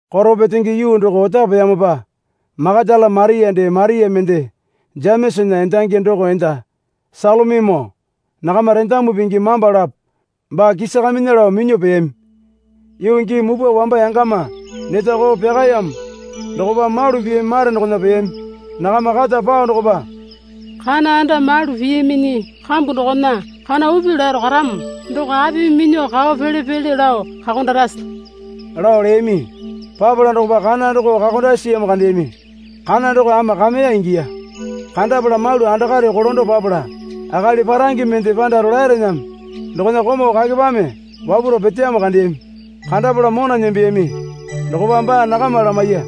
Koro petenge yuu doko otapeyamopa Makatala Maria dee Maria mende Jemesana endangi doko enda Salomimoo nakama rendamu pingi mamba lapo baa kisakaminya lao minyuo peyami. Yuu gii mupwa wamba yangama neta koo pyakayamo dokopa malu piyami mare dokona peyami. Nakama keta pao dokopa, Kana anda malu piyaminyi kambu dokona kana upi laro karamo doko apimi minyuo kao pele pele lao kakondakarase? lao leyami. Papala dokopa kana doko kakondasi siyamo kandeyami. Kana doko ama kameya ingiya. Kandapala malu andakare kolando papala akali parange mende panda rolaerename dokona komau kakepame wapwaro peteyamo kandeyami. Kandapala mona nembeyami. Dokopa baa nakama lamaiya.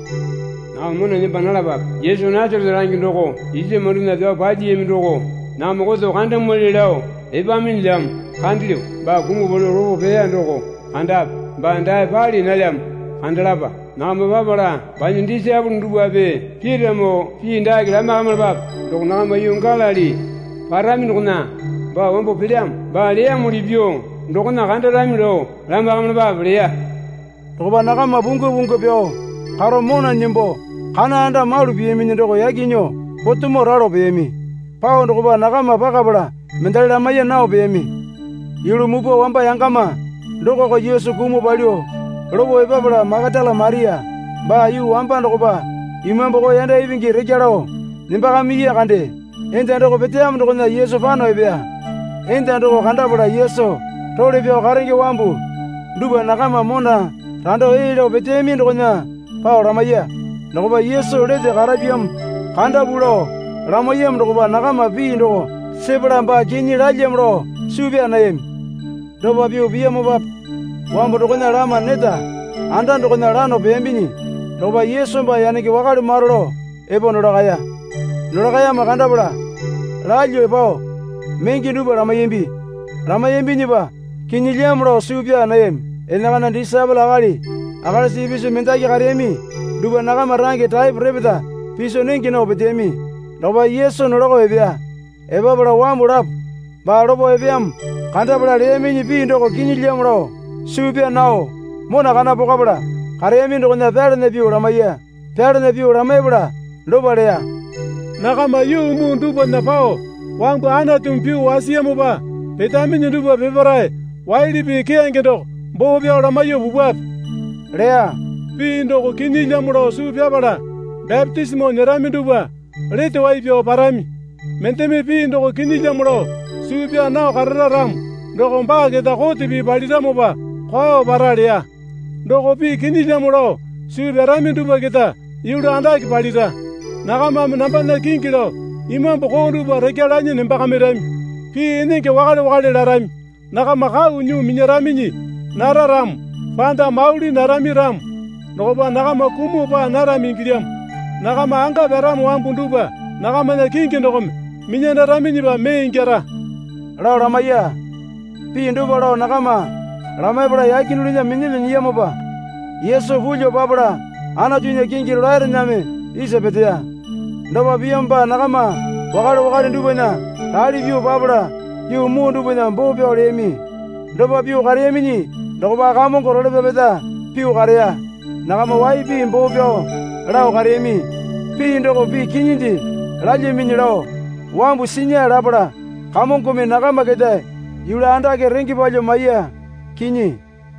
Nakama mona nemba nalapape. Yesu Nasarete range doko isa mamandona pyao palyiyami doko nakama koto kandamwali lao epaminyilyamo kandelyo. Baa kumuo palyuo lopo peya doko kandape. Baa dae pali nalyamo kandalapa. Nakama papala banya disaepole dupwape Pitamoo pii dake lamaiyakamilapape. Doko nakama yuu Galili parami dokona baa wambo pelyamo. Baa leyamuli pyuo dokona kandarami lao lamaiyakamilapape, leya. Dokopa nakama pungwa pungwa pyao karo mona nembo kana anda malu piyaminyi doko yaki nyuo potemo ralo peyami. Pao dokopa nakama pakapala mendali lamaiya nao peyami. Yulu mupwa wamba yangama dokoko Yesu kumuo palyuo lopo epapala Makatala Maria baa yuu wamba dokopa imambu koo yanda ipingi rekya lao nembakamiya kande, enda doko peteyamo dokona Yesu pano epeya. Enda doko kandapala Yesu role pyao karenge wambu dupwa nakama mona rando ee lao peteyami dokona pao lamaiya. Dokopa Yesu lete karapyamo kandapu lao lamaiyamo dokopa nakama pii doko sepala baa kinyi lalyamo lao suu pyaa nayami. Dopa pyuo piyamopape wambu dokona lama neta anda dokona lano peyambinyi dokopa Yesu baa yanenge wakale maro lao epo nolakaya. Nolakayamo kandapala lalyuo pao menge dupwa lamaiyambi. Lamaiyambinyipa kinyilyamo lao suu pyaa nayami. Enakana disaepole akali akalisa ipisu mendaki kareyami dupwa nakama range taepo repeta piso nenge nao peteyami dokopa Yesu nolako epeya. Epapala wambu lapo baa lopo epeyamo kandapala leyaminyi pii doko kinyilyamo lao suu pyaa nao mona kana pokwapala kareyami dokona pyalana pyuo lamaiya. Pyalana pyuo lamaipala dopa leya. Nakama yuu muu dupwana pao wambu Anatumi pyuo wasiyamopa petaminyi dupwa peparae waili pii keyange doko boo pyao lamaiyuo pupwape, leya. Pii doko kinyilyamo lao suu pyapala bapitisimo nyerami dupwa lete wai pyao parami. Mendeme pii doko kinyilyamo lao suu pyaa nao karara ramo doko baa keta kote pii paliramopa kwao para leya. Doko pii kinyilyamo lao suu pyarami dupwa keta yulu andake palira. Nakamame nambana kingi lao imambu koo dupwa rekya lanyi nembakamirami. Pii enenge wakale wakale larami. Nakama kau nyuo minyaraminyi nara ramo, panda mauli narami ramo, dokopa nakama kumuo paa narami ingilyamo. Nakama anga pyaramo wambu dupwa nakamana kingi dokome minyandaraminyipa mee ingyara, lao lamaiya. Pii dopa lao nakama lamaipala yake dulunya minyalyuo nyiyamopa Yesu pulyuo papala Anatunya kingi rolaerename isa peteya. Dopa piyamopa nakama wakale wakale dupwana rali pyuo papala yuu muu dupwana boo pyao leyami. Dopa pyuo kareyaminyi dokopa Kamongo role pyapeta pyuo kareya. Nakama wai pii boo pyao lao kareyami pii doko pii kinyinde lalyaminyi lao wambu sinya lapala Kamongome nakama keta yulu andake renge palyuo maiya. Kinyi.